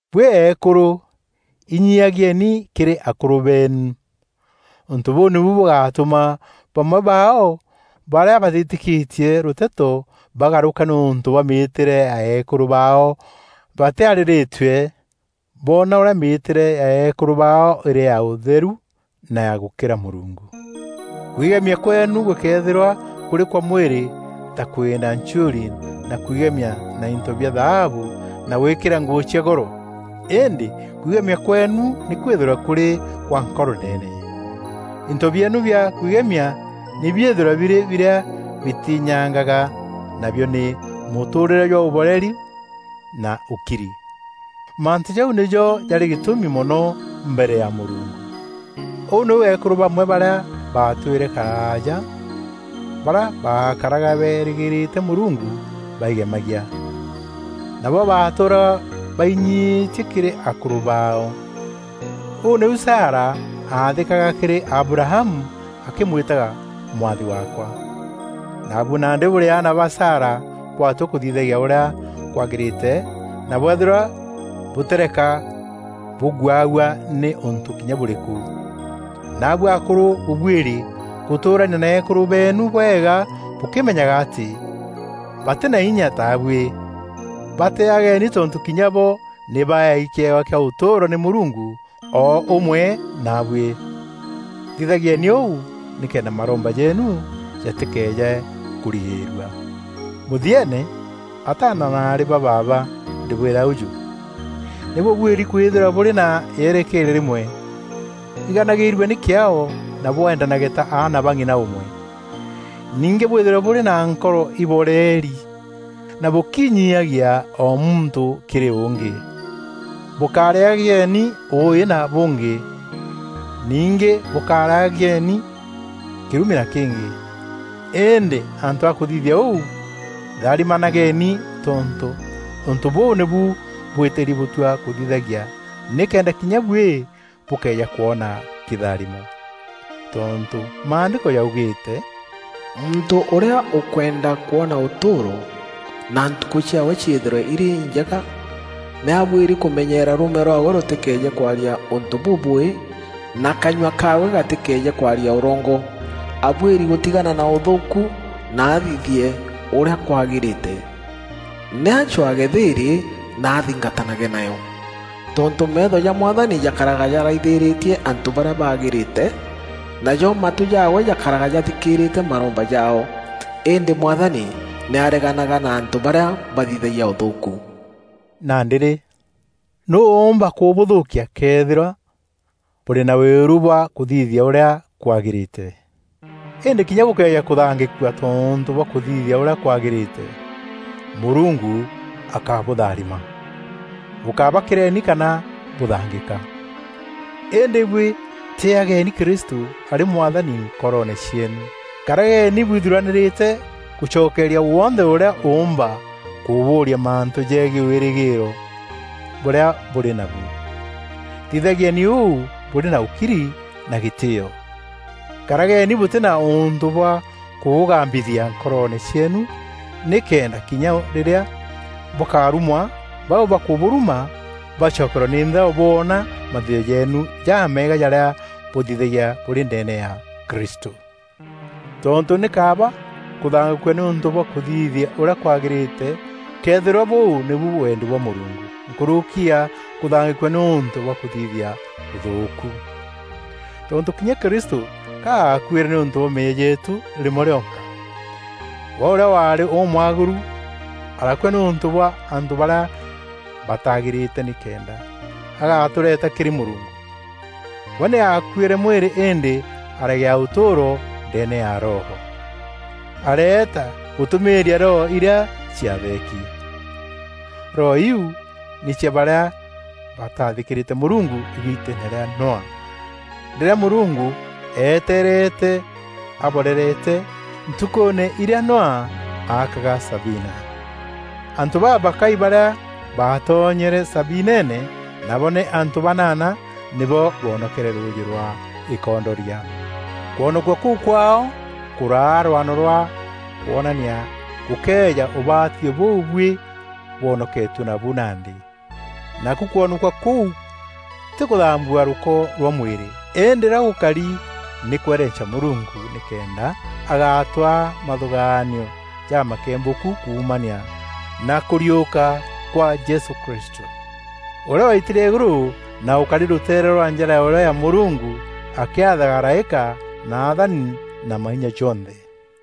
Buî eekûrû, inyiiagieni kîrî akûrû beenu. Ûntû bûu nîbu bûgatûma bamwe baao barîa batîtîkîtie rûteto bagarûka nîûntû bwa mîtîre ya eekûrû baao batîarîrîtue, boona ûrîa mîîtîre ya eekûrû baao îrî ya ûtheru na ya gûkîra Mûrungu. Kwigemia kweenû gûkéethîrwa kûrî kwa mwîrî ta kwîînda nchiûri na kwigemia na into bia thaabu na gwîkîra nguû cia goro. Îndî kwigemia kweenu nî kwîthîrwe kûrî gwa nkoro ndeene. Into bieenu bia kwigemia nî biîthîrwe birî birîa bitîînyangaga nabio nî mûtûûrîre jwa ûboreri na ûkiri. Mantû jau nîjo jarî gîtûmi mono mbere ya Mûrungu. Ûu nîu eekûrû bamwe barîa baatwîre karaaja barîa baakaraga beerîgîîrîte Mûrungu baigemagia. Nabo baatûûraga bainyiîtie kîrî akûrû baao. Ûu nîu Sara aathîkaga kîrî Abrahamu akîmwîtaga mwathi waakwa. Naabuî nandî bûrî aana ba Sara bwatua kûthithagia ûrîa kwagîrîte na bweethîrwa bûtîreka bûguawua nî ûntû kinya bûrîkû. Naabuî akûrû bûbuîri gûtûûrania na eekûrû beenu bwega bûkîmenyaga atî batî na inya taabuî. Batîîageni tontû kinya bo nî baeei kîewa kîa ûtûûro nî Mûrungu o ûmwe naabuî. Thithagieni ûu nîkenda maromba jeenu jatîkeeje kûrigîîrua. Mûthieene, ataana na aarî ba baaba, ndîbwîra ûjû: nî bûbuîri kwîthîrwa bûrî na yerekeeria rîmwe. Iganagîîrueni kîaao na bwendanage ta aana ba ng'ina ûmwe. Ningî bwîthîrwe bûrî na nkoro ibooreri na bûkinyiiagia o muntû kîrî ûngî. Bûkárîagieni ûûî na bûngî. Ningî bûkárîagieni kîrumi na kîngî. Îndî antû a kûthithia ûu, tharimanageni tontû ûntû bûu nîbu bwîtîri bûtua kûthithagia nîkenda kinya buî bûkeeja kwona kîtharimo. Tontû Maandîko jaugîîte, “Muntû ûrîa ûkwenda kwona ûtûûro, na ntukû ciaawe ciîthîrwe îrî injega, nî abuîri kûmenyeera rûûme rwaawe rûtîkeeje kwaria ûntû bûbûûî na kanyua kaawe gatîkeeje kwaaria ûrongo. Abuîri gûtigana na ûthûûku na athithie ûrîa kwagîrîte; nî acwaage thîîrî na athingatanage nayo. Tontû meetho ja Mwathani jakaraga jaraithîrîtie antû barîa bagîrîte, najo matû jaawe jakaraga jathikîîrîte maromba jaao. Îndî Mwathani nî areganaga na antû barîa bathithagia ûthûûku.” Nandî rî, nûû ûûmba kûbûthûûkia këethîrwa bûrî na wîru bwa kûthithia ûrîa kwagîrîte? Îndî kinya bûkëeja kûthangîkua tontû bwa kûthithia ûrîa kwagîrîte, Mûrungu akabûtharima. Bûkábakîreni kana bûthangîka. Îndî buî tîîageni Kristû arî Mwathani nkoroone cieenu. Karageni bwithuranîrîte gûcokeria wonthe ûrîa ûûmba kûbûria mantû jegiî wîrîgîîro bûrîa bûrî nabu. Thithagieni ûu bûrî na ûkiri na gîtîîo. Karageni bûtî na ûntû bwa kûbûgambithia nkoroone cieenu nîkenda kinya rîrîa bûkarumwa, bau bakûbûruma bacokerwe nî nthao boona mathithio jeenu jameega jarîa bûthithagia bûrî ndeene ya Kristû. Tontû nî kaaba kûthangîkua nîûntû bwa kûthithia ûrîa kwagîrîte këethîrwa bûu nîbu wendi bwa Mûrungu nkûrûki ya kûthangîkua nîûntû bwa kûthithia ûthûûku. Tontû kinya Kristû ka aakuîre nîûntû bwa meeyia jeetû rîmwe rîonka. We ûrîa waarî ûmwagîru arakua nîûntû bwa antû barîa bataagîrîte nîkenda agatûreeta kîrî Mûrungu. We nî aakuîre mwîrî îndî aragîa ûtûûro ndeene ya Roho. Areeta gûtûmîîria roho irîa ciatheeki. Roho iu nî cia barîa bataathîkîrîte Mûrungu îgiiteene rîa Noa rîrîa Mûrungu eeteerete aboorerete ntukûûne irîa Noa aakaga sabina. Antû babakai barîa baatonyere sabineene, nabo nî antû banana, nîbo boonokere rûûjî rwa îkondoria. Kwonokua kûu kwaao kûraa rwano rwa kwonania gûkeeja ûbatithio bûu buî bwonoketue nabu nandî. Naku kwonokua kûu tî kûthambua rûko rwa mwîrî, îndî ûrîa gûkari nî kwerenca Mûrungu nîkenda agatwaa mathûgaanio jamakembûku kuumania na kûriûka kwa Jesû Kristû, ûrîa waitîrie îgûrû na ûkari rûteere rwa njara ya ûrîo ya Mûrungu akîathaga araîka na athani na mainya jonthe.